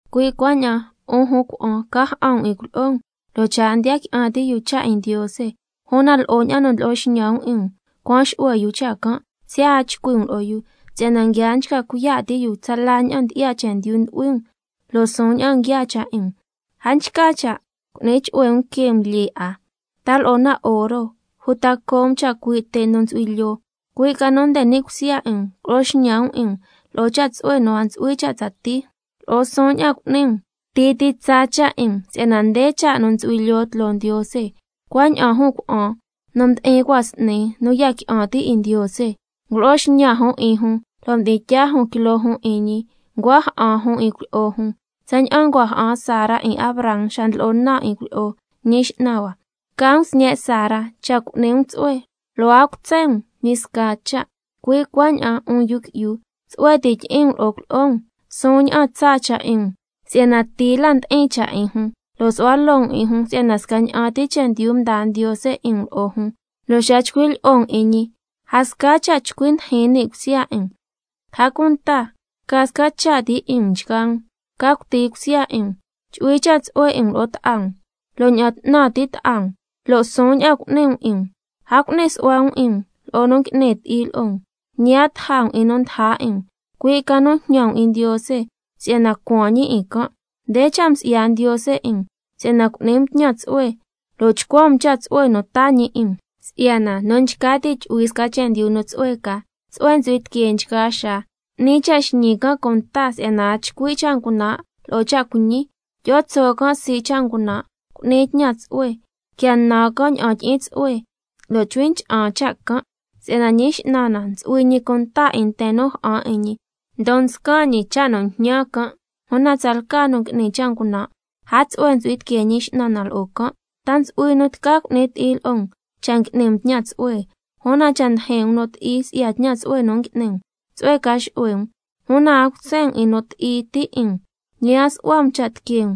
Cui' cuaña'an 'un jun cuna'an, ca ja'an um 'in cuilyi'o um, lo' cha' a ndiya qui'an ti' yu cha' 'in Ndiose, una lo'o ña'an nu ndlo'o xñan um 'in um cuan xu'hue yu cha' can', siya' a chcui' um lo'o yu, si'yana nguia nchca cuiya' ti' yu tsala ña'an ndyi'ya chendyu ndu'hui um, lo' suun ña'an nguiaa cha' 'in um. A nchca cha' cu'ni chu'hue um que um lyee 'a, ta lo'o na oro, uta co' um chacui' te' nu ntsu'hui lyoo, cui' ca nu nde ni' cusya 'in um culo'o xñan um 'in um lo'o cha' tsu'hue nu a ntsu'hui cha' tsatii, lo'o suun ña'an cu'ni um, cuti ti tsaa cha' 'in um, si'yana nde cha' nu ntsu'hui lyoo tloo Ndiose. Si'yana cuaña'an jun cuna'an nu mdi'in cua' s'ni nu ya qui'an ti' 'in Ndiose, ngulo'o xñan jun 'in jun lo' mdi'in tyaa jun quiloo jun 'in ñi, ncua ja'an jun 'in cuilyi'o jun, tsaña'an ncua ja'an Sara 'in Abraham xa ndlo'o naan 'in cuilyi'o: Ñi x'nan hua. Ca um sñe' Sara cha' cu'ni um tsu'hue lo' a cutsen um ñi sca cha'. Cui' cuaña'an 'un yu qui'yu, tsu'hue ti tyi'in um lo'o cuilyi'o um, suun ña'an tsaa cha' 'in um si'yana ti la ndi'in cha' 'in jun, lo' su'hua loo um 'in jun si'yana scaña'an ti chendyu mdaa Ndiose 'in um lo'o jun, lo' xa chcui' lyi'o um 'in ñi a sca cha' chcui ndijin ni' cusya 'in um. A cunta ca sca cha' ti 'in um nchgaa um, ca cuti cusya 'in um, chu'hui cha' tsu'hue 'in um lo'o ta'a um, lo' ña'an 'tnan ti' ta'a um, lo' suun ña'an cu'ni um 'in um. A cu'ni su'hua um 'in um lo'o nu ngui'ni ti'i lo'o um, ñi a taja um 'in nu ndaja 'in um, cui' ca nu jñan um 'in Ndiose si'yana cuan ñi 'in can'. Nde cha' msi'ya Ndiose 'in um, si'yana cu'ni um tñan tsu'hue lo' chcuan um cha' tsu'hue nu taa ñi 'in um. Si'yana, —nu nchca ti' tyu'hui sca chendyu nu tsu'hue ca, tsu'hue ntsu'hui tiquee nchgaa xaa, 'ni cha' xñi can' cunta si'yana a chcui' cha' ngunan' lo'o cha' cuiñi. Tyi'o tso' can' sii' cha' ngunan', cu'ni tñan tsu'hue, quia nan can' ña'an tyi'in tsu'hue, lo' chcui ncha'an cha' can'. Si'yana Ñi X'nan na ntsu'hui ñi cunta 'in nten nu ja'an 'in ñi, ndon nscan ñi cha' nu njñan can', una tsalca nu ngui'ni cha' ngunan' a tsu'hue ntsu'hui tiquee Ñi X'nan na lo'o can'—. ¿Ta ntsu'hui nu tca cu'ni ti'i lo'o um, cha' ngui'ni um tñan tsu'hue? Una cha' ndijin um nu ti'i si'ya tñan tsu'hue nu ngui'ni um, tsu'hue ca xu'hue um. Una a cutsen um 'in nu ti'i ti' 'in um, ñi a su'hua um cha' tiquee um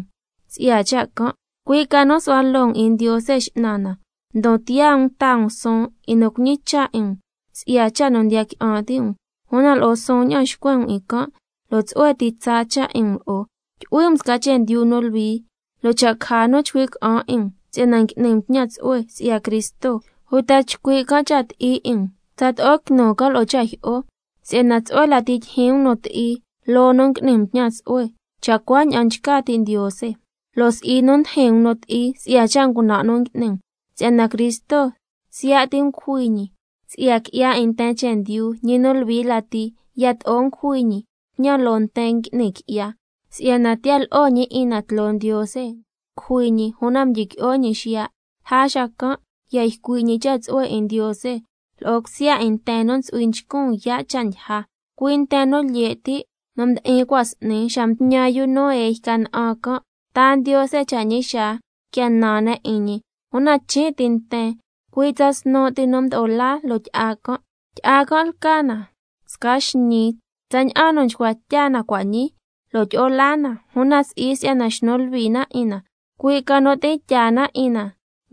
si'ya cha' can', cui' ca nu su'hua loo um 'in Ndiose X'nan na, ndon tiyaa um taa um suun 'in nu cuñicha' 'in um si'ya cha' nu ndiya qui'an ti' um, una lo'o suun ña'an xcuen um 'in can' lo' tsu'hue ti tsaa cha' 'in um lo'o. Tyu'hui um sca chendyu nu luhui, lo' cha' caja nu chcui' ca'an 'in um si'yana ngui'ni um tñan tsu'hue si'ya Cristo, uta chcui' can' cha' ti'i 'in um, tsato'o quinu can' lo'o cha' jyi'o. Si'yana tsu'hue lati tyijyin um nu ti'i loo nu ngui'ni um tñan tsu'hue, cha' cuaña'an nchca ti' Ndiose, lo' si'i nu ndijin um nu ti'i si'ya cha' ngunan' nu ngui'ni um. Si'yana Cristo siya' ti ngujui ñi si'ya qui'ya 'in nten chendyu, ñi nu luhui lati yato'o ngujui ñi tñan loo nten ngui'ni qui'ya, si'yana tiya lo'o ñi 'in na tloo Ndiose, ngujui ñi una mdyiqui'o ñi xiya'. Lja xacan' ya ycui' ñi cha' tsu'hue 'in Ndiose lo'o cusya 'in nten nu ntsu'hui nchcun yaa' cha' ndyija, cui' nten nu lye' ti' nu mdi'in cua' s'ni xa mtñan yu Noé yca na'an can', nta Ndiose cha' ñi xaa quia nan ne' 'in ñi, una chin' ti nten, cui' tsa snu' ti nu mdo'o laa loo tyi'a can'. Tyi'a can' lca na sca xñii tsaña'an nu nchcua tya na cua' ñii lo' tyi'o laa na, (una si'i si'yana xnu luhui na 'in na, cui' ca nu tyi'in tyaa na 'in na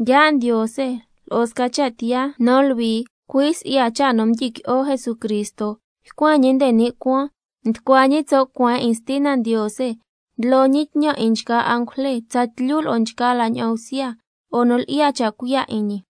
yaa' Ndiose lo'o sca cha' tiyaa nu luhui), cui' si'ya cha' nu mdyiqui'o Jesucristo. Ycuen ñi nde ni' cuaan, nducua ñi tso' cueen 'in Stina Ndiose, ndlo ñi tñan 'in nchgaa angujle, tsatlyu lo'o nchgaa la ña'an bsya lo'o nu lyi'ya cha' cuiya' 'in ñi.